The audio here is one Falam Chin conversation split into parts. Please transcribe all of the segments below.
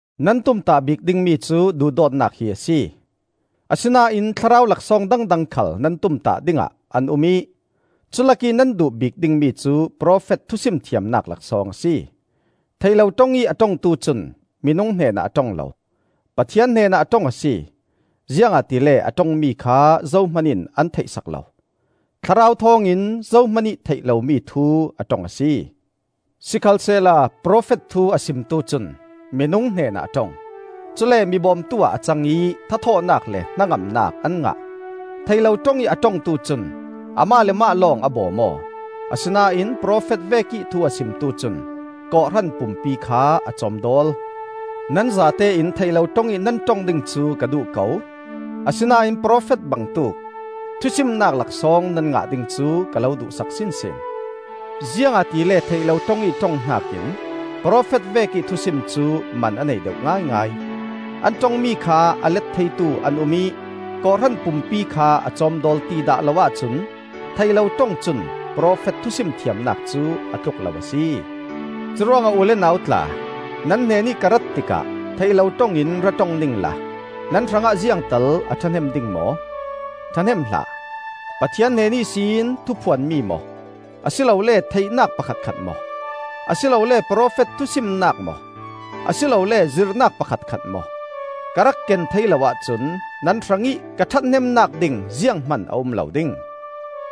Nan tumtah bik dingmi cu duhdawtnak hi a si. Asinain Thlarau laksawng dangdang khal nan tumtah dingah an um ih culak ih nan duh bik dingmi cu profet thusim thiamnak laksawng a si. Theih lo ṭong ih a ṭongtu cun minung hnenah a ṭong lo, Pathian hnenah a ṭong a si, ziangahtile a ṭongmi kha zohman in an theihsak lo. Thlarau thawngin zohmanih theih lomi thu a ṭong a si. Sikhalsehla profet thu a simtu cun minung hnenah a ṭong, cule mi bawmtu ah a cang ih tha-thawhnak le hnangamnak an ngah. Theih lo ṭong ih a ṭongtu cun amah le amah lawng a bawm aw; asinain profet vekih thu a simtu cun kawhhran pumpi kha a cawmdawl. Nan zatein theih lo ṭong ih nan ṭong ding cu ka duh ko; asinain profet bangtuk thusimnak laksawng nan ngah ding cu ka lo duhsak sinsin. Ziangahtile theih lo ṭong ih ṭong hnakin profet vekih thusim cu man a nei deuh ngaingai. An ṭongmi kha a let theitu an um ih kawhhran pumpi kha a cawmdawl ti dah lo ahcun theih lo ṭong cun profet thusim thiamnak cu a tluk lo a si. Curuangah u le nau tla, nan hnenih ka rat tikah theih lo ṭong in ra ṭong ningla nan hrangah ziangtal a ṭhahnem ding maw? ṭhahnem hlah! Pathian hnen ihsin thuphuanmi maw, a si lole theihnak pakhatkhat maw, a si lole profet thusimnak maw, a si lole zirhnak pakhatkhat maw, ka rak ken thei lo ahcun nan hrangih ka ṭhathnemnak ding zianghman a um lo ding.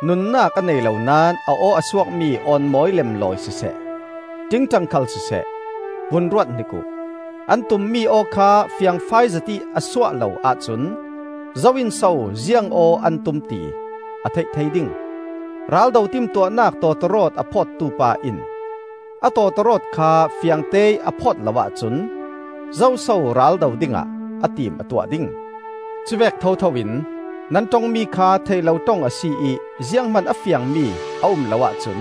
Nunnak a nei lo naón a aw a suakmi awnmawi lemlawi siseh, ṭingṭang khal siseh, vun ruat hnik uh; an tummi aw kha fiangfai zetih a suah lo ahcun zo in so ziang aw an tum ti a theih thei ding? Raldo timtuahnak tawtawrawt a phawtu pa in a tawtawrawt kha fiangteih a phawt lo ahcun zoso ral do dingah a tim a tuah ding? Cuvek thotho in nan ṭongmi kha theih lo ṭong a si ih zianghman a fiangmi a um lo ahcun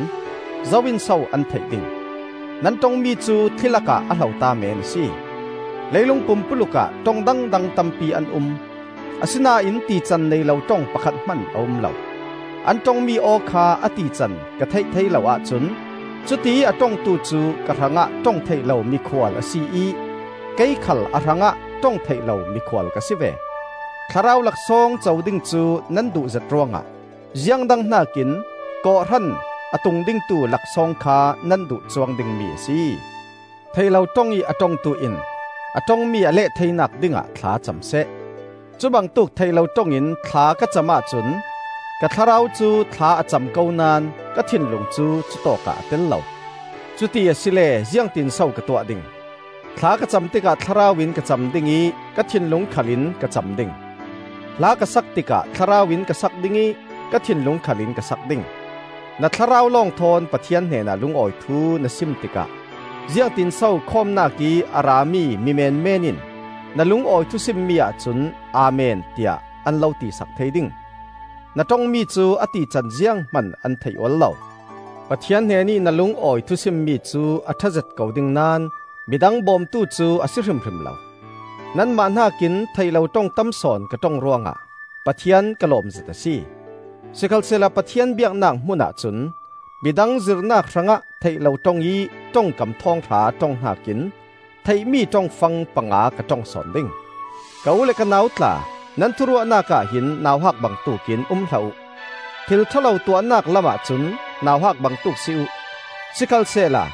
zo in so an theih ding? Nan ṭongmi cu thli lakah a hlota meen a si. Leilung pumpuluk ah ṭong dangdang tampi an um; asinain tican nei lo ṭong pakhat hman a um lo. An ṭongmi aw kha a tican ka theih thei lo ahcun cutiih a ṭongtu cu ka hrangah ṭong theih lo mikhual a si ih kei khal a hrangah ṭong theih lo mikhual ka si ve. Thlarau laksawng co ding cu nan duhzet ruangah ziang dang hnakin kawhhran a tungdingtu laksawng kha nan duh cuang dingmi a si. Theih lo ṭong ih a ṭongtu in a ṭongmi a leh theinak dingah thla cam seh. Cubangtuk theih lo ṭong in thla ka cam ahcun ka thlarau cu thla a cam ko naón ka thinlung cu cutawkah a tel lo. Cuti asile ziangtinso ka tuah ding? Thla ka cam tikah thlarau in ka cam ding ih ka thinlung khal in ka cam ding. Hla ka sak tikah thlarau in ka sak ding ih ka thinlung khal in ka sak ding. Na thlarau lawng thawn Pathian hnenah lungawi thu na sim tikah ziangtinso khawmnak ih a rami mimenmen in na lungawi thusimmi ahcun “Amen” tiah an lo ti sak thei ding? Na ṭongmi cu a tican zianghman an theih ual lo. Pathian hnenih na lungawi thusimmi cu a ṭhazet ko ding naón midang bawmtu cu a si hrimhrim lo. Nanmah hnakin theih lo ṭong tam sawn ka ṭong ruangah Pathian ka lawmzet a si. Sikhalsehla Pathian biaknak hmunah cun midang zirhnak hrangah theih lo ṭong ih ṭongkam thawnghra ṭong hnakin theihmi ṭongfang panga ka ṭong sawn ding. Ka u le ka nau tla, nan thuruahnak ahhin nauhak bangtuk in um hlah uh. Thil ṭha lo tuahnak lamah cun nauhak bangtuk si uh; sikhalsehla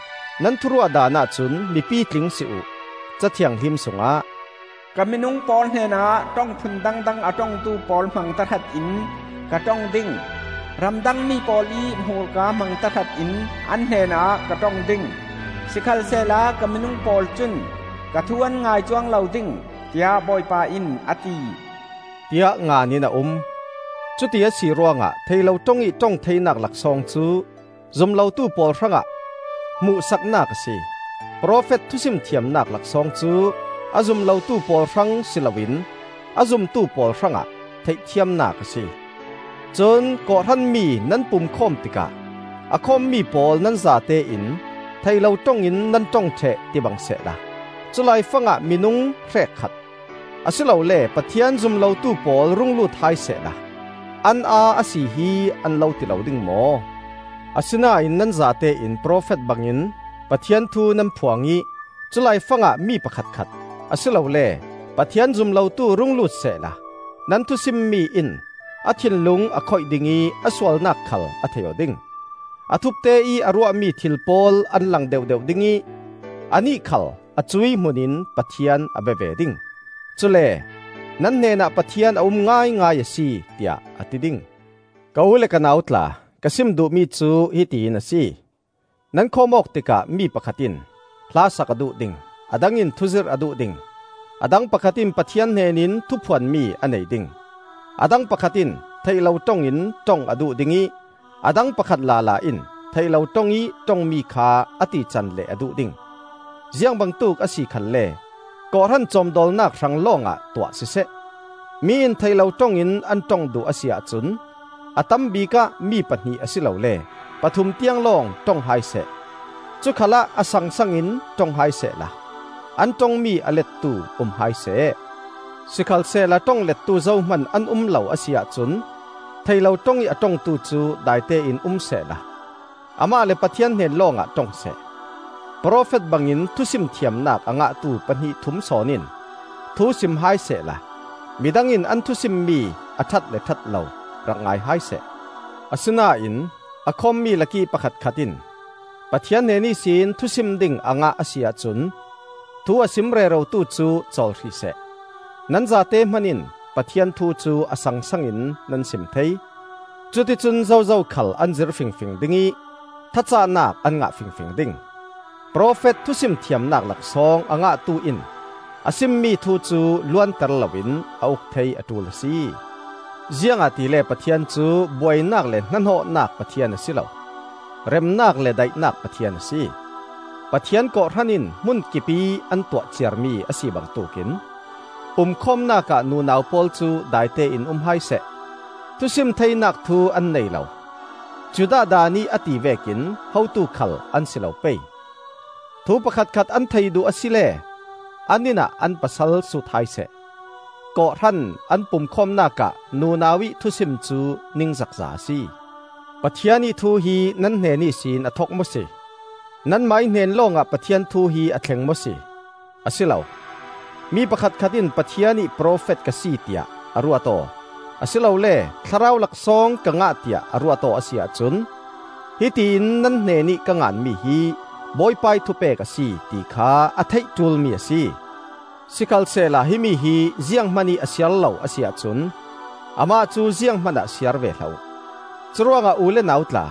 nan thuruahdanah cun mi pitling si uh. Ca Thianghlim sungah, “Ka minung pawl hnenah ṭong phun dangdang a ṭongtu pawl hmang tahratin ka ṭong ding; Ramdang mi pawl ih hmurka hmang tahratin an hnenah ka ṭong ding; Sikhalsehla ka minung pawl cun ka thu an ngai cuang lo ding; tiah Bawipa in a ti,” tiah ngan in a um. Cuti a si ruangah theih lo ṭong ih ṭong theinak laksawng cu zum lotu pawl hrangah hmuhsaknak a si. Profet thusim thiamnak laksawng cu a zum lotu pawl hrang si loin a zumtu pawl hrangah theihthiamnak a si. Cun kawhhran mi nan pumkhawm tikah a khawmmi pawl nan zatein theih lo ṭong in nan ṭong ṭheh tibang sehla culaifang ah minung hrekkhat, a si lole Pathian zum lotu pawl rung lut hai sehla an aa a sihi an lo ti lo ding maw? Asinain nan zatein profet bangin Pathian thu nan phuang ih culaifang ah mi pakhatkhat, a si lole Pathian zum lotu rung lut sehla nan thusimmi in a thinlung a khoih ding ih a sualnak khal a thei aw ding. A thupte ih a ruahmi thil pawl an lang deuhdeuh ding ih anih khal a cuih hmun in Pathian a bia ve ding; cule “Nan hnenah Pathian a um ngaingai a si,” tiah a ti ding. Ka u le ka nau tla, ka sim duhmi cu hiti in a si: Nan khawm-awk tikah mi pakhat in hlasak a duh ding, a dang in thuzirh a duh ding, a dang pakhat in Pathian hnenin thuphuanmi a nei ding, a dang pakhat in theih lo ṭong in ṭong a duh ding ih a dang pakhat lala in theih lo ṭong ih ṭongmi kha a tican leh a duh ding. Ziangbangtuk a si khalle kawhhran cawmdawlnak hrang lawngah tuah siseh. Mi in theih lo ṭong in an ṭong duh a si ahcun a tam bikah mi pahnih asilole pathum tiang lawng ṭong hai seh; cu khalah a sangsang in ṭong hai sehla an ṭongmi a lettu um hai seh. Sikhalsehla ṭong lettu zohman an um lo a si ahcun theih lo ṭong ih a ṭongtu cu daitein um sehla amah le Pathian hnen lawngah ṭong seh. Profet bangin thusim thiamnak a ngahtu pahnih thum sawn in thusim hai sehla midang in an thusimmi a ṭhat le ṭhat lo rak ngai hai seh. Asinain a khawmmi lakih pakhatkhat in Pathian hnen ihsin thusim ding a ngah a si ahcun thu a sim rerotu cu cawl hrih seh. Nan zate hman in Pathian thu cu a sangsang in nan sim thei; cuticun zozo khal an zir fingfing ding ih thacahnak an ngah fingfing ding. Profet thusim thiamnak laksawng a ngahtu in a simmi thu cu luanter loin a uk thei a ṭul a si, ziangahtile Pathian cu buainak le hnahnawhnak Pathian a si lo; remnak le daihnak Pathian a si. Pathian kawhhran in hmun kipih an tuah ciarmi a si bangtuk in, pumkhawmnak ah nunau pawl cu daitein um hai seh. Thusim theinak thu an nei lo; Judah Daan ih a ti vekin hotu khal an si lo pei. Thu pakhatkhat an thei duh asile an inn ah an pasal sut hai seh. kawhhran an pumkhawmnak ah nunau ih thusim cu ningzakza a si. Pathian ih thu hi nan hnen ihsin a thok maw si? Nanmah ih hnen lawngah Pathian thu hi a thleng maw si? A si lo! Mi pakhatkhat in Pathian ih profet ka si tiah a ruat aw, a si lole thlarau laksawng ka ngah tiah a ruat aw a si ahcun, hiti in nan hnenih ka ngan mi hi Bawipa ih thupek a si, ti kha a theih ṭulmi a si. Sikhalsehla himi hi zianghman ih a siar lo a si ahcun amah cu zianghman ah siar ve hlah uh. Curuangah u le nau tla,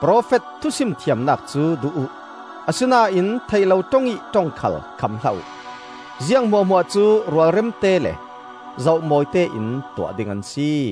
profet thusim thiamnak cu duh uh; asinain theih lo ṭong ih ṭong khal kham hlah uh. Ziang hmuahhmuah cu rualremte le zoh mawite in tuah ding an si.